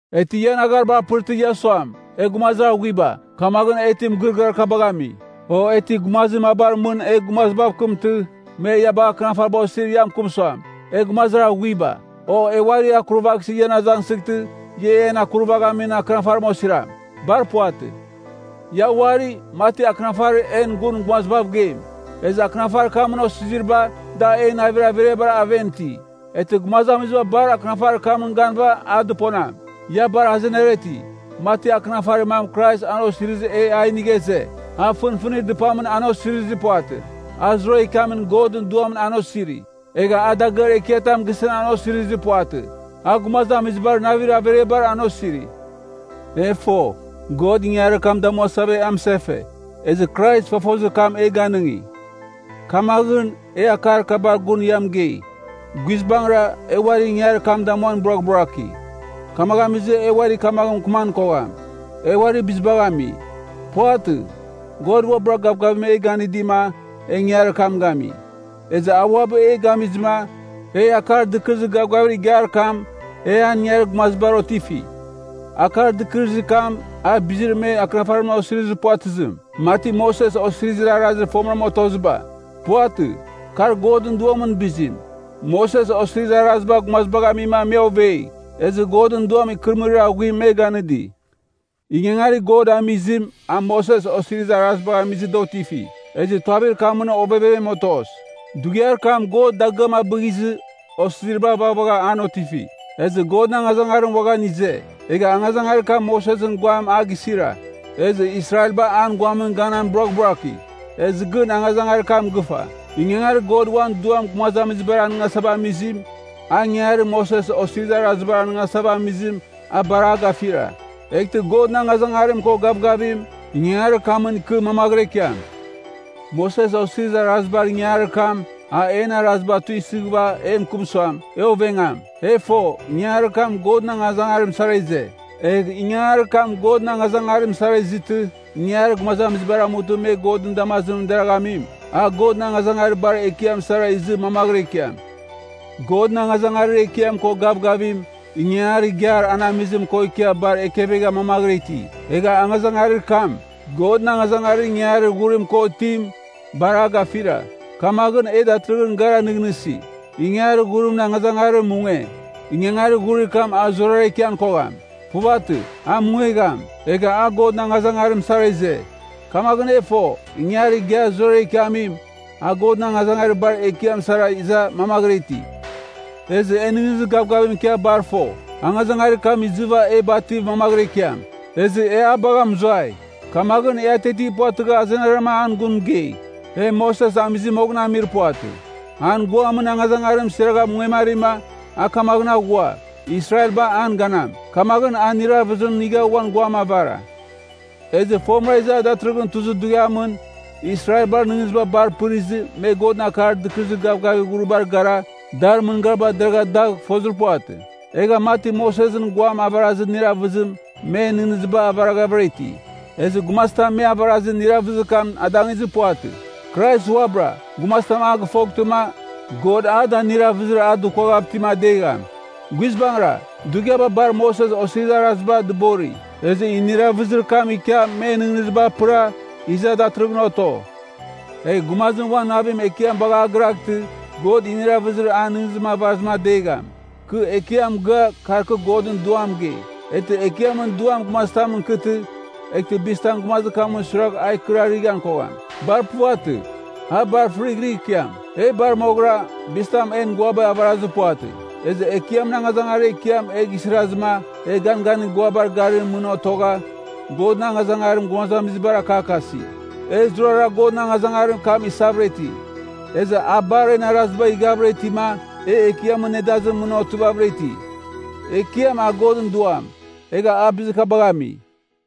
E ti ian aghariba apɨrtɨ, ia suam, e gumazir aghuiba, kamaghɨn e ti mɨgɨrɨgɨar kabagh ami? O e ti gumazir mabar mɨn e gumazibav kɨmtɨ, me ia bagh akɨnafariba osir ia mɨkɨm suam, e gumazir aghuiba? O e uarir akurvaghsɨ ian azangsɨghtɨ, ia en akurvaghamin akɨnafarim osiram? Bar puvatɨ! Ia uari, mati akɨnafarir en gun gumazibav geim. Ezɨ akɨnafarir kamɨn osiziriba, da en navir averiabar aven iti. Eghtɨ gumazamiziba bar akɨnafarir kamɨn ganɨva a dɨponam. Ia bar azenara iti, mati akɨnafarir mam Krais an osirizɨ e a inigha ize. A fɨnfɨnir dɨpamɨn an osirizir puvatɨ. A zurara ikiamin Godɨn Duamɨn an osiri. Egha a dagɨar ekiatam gisɨn an osirizir puvatɨ. A gumazamizibar navir averiabar an osiri. E fo, God ingangarir kam damuasava e amɨsefe. Ezɨ Krais fofozir kam e ganɨngi. Kamaghɨn, e akar kabar gun ia mɨgei. Guizbangɨra, e uari ingangarir kam damuan buraghburaki, kamaghɨn amizɨ e uari kamaghɨn mɨkɨman kogham, e uari bizibagh ami. Puvatɨ, God uabɨra gavgavim e ganɨdima, e ingangarir kam gami. Ezɨ a uabɨ e gamizɨma, e Akar Dɨkɨrɨzir Gavgavir Igiar kam, e an ingangarir gumazibar otifi. Akar Dɨkɨrɨzir kam, a bizir me akɨnafarimɨn osirizir puvatɨzim, mati Moses Osirizir Arazir fomɨram otoziba. Puvatɨ. Kar Godɨn Duamɨn bizim. Moses Osirizir Araziba gumazibagh amima me ovei. Ezɨ Godɨn Duam ikɨrɨmɨrir aghuim me ganɨdi. Ingangarir God amizim, a Moses Osirizir Arazibagh amizɨ da otifi. Ezɨ tuavir kamɨn ovevem otos. Dughiar kam God dagɨam abɨghizɨ, osiziriba vaghavagha an otifi, ezɨ Godɨn angazangarim uaghan ize. Egha angazangarir kam Mosesɨn guam a gisira, ezɨ Israelba an guamɨn ganan buraghburaki. Ezɨ gɨn angazangarir kam gɨfa. Ingangarir God uan Duam gumazamizibar anɨngasava amizim, a ingangarir Moses Osirizir Araziba anɨngasava amizim, a bar a gafira. Eghtɨ Godɨn angazangarim ko gavgavim, ingangarir kamɨn ikɨ mamaghɨra ikiam. Moses Osirizir Arazibar ingangarir kam, a en araziba tuisɨghɨva e mɨkɨm suam, e ovengam. E fo, ingangarir kam Godɨn angazangarim sara ize. Egh ingangarir kam Godɨn angazangarim sara izɨtɨ, ingangarir gumazamizibar amutɨ me Godɨn damazimɨn deraghamim, a Godɨn angazangarir bar ekiam sara izɨ mamaghɨra ikiam. Godɨn angazangarir ekiam ko gavgavim, ingangarir igiar an amizim ko ikia bar ekevegha mamaghɨra iti. Egha angazangarir kam, Godɨn angazangarir ingangarir ghurim ko itim, bar a gafira. Kamaghɨn, e datɨrɨghɨn gara nɨghnɨsi, ingangarir ghurimɨn angazangarim munge. Ingangarir ghurir kam a zurara ikian kogham. Puvatɨ, a mungegham. Egha a Godɨn angazangarim sara ize. Kamaghɨn e fo, ingangarir igiar zurara ikiamim, a Godɨn angazangarir bar ekiam sara iza mamaghɨra iti. Ezɨ e nɨghnɨzir gavgavim ikia bar fo, angazangarir kam izɨva e bativ mamaghɨra ikiam, ezɨ a bagha mɨzuai. Kamaghɨn, e atiati puvatɨgha azenara an gun mɨgei. E Moses amɨzɨ moghɨn amir puvatɨ. An guamɨn angazangarim siragha mungemarima, a kamaghɨn aghua, Israelba an ganam. Kamaghɨn a iniravɨzim inigha uan guam avara. Ezɨ fomɨra iza datɨrɨghɨn tuzir dughiamɨn, Israelbar nɨghnɨziba bar pɨrizɨ, me Godɨn Akar Dɨkɨrɨzir Gavgavir Ghuribar gara, dar mɨngariba deragha dagh fozir puvatɨ. Egha mati Mosesɨn guam avarazir iniravɨzim, men nɨghnɨziba avaraghavɨra iti. Ezɨ gumazitam me avarazir iniravɨzir kam adangizir puvatɨ. Krais uabɨra, gumazim a gɨfoghtɨma, God a da iniravɨzir a dukuaghav itim adegham. Guizbangɨra, dughiaba bar me Moses Osirizir Araziba dɨbori, ezɨ iniravɨzir kam ikia men nɨghnɨziba apɨra, iza datɨrɨghɨn oto. Egh gumazim uan navim Ekiam bagh a giraghtɨ, God iniravɨzir an nɨghnɨzim avarazim adegham. Kɨ Ekiam mɨgɨa, kar kɨ Godɨn Duam mɨgei. Eghtɨ Ekiamɨn Duam gumazitamɨn ikɨtɨ, eghtɨ bizitam gumazir kamɨn suiragh a ikɨrarighan kogham. Bar puvatɨ. A bar fɨrighrɨgh ikiam. E bar moghɨra, bizitam en guaba avarazir puvatɨ. Ezɨ Ekiamɨn angazangarir ekiam e gisirazɨma, e ganganir guabar garimɨn mɨn otogha, Godɨn angazangarim gumazamizibar akakasi. E zurara Godɨn angazangarir kam isavɨra iti, ezɨ a bar en arazibagh ighavɨra itima, e Ekiamɨn nedazimɨn mɨn otivavɨra iti. Ekiam, a Godɨn Duam, egha a bizir kabagh ami.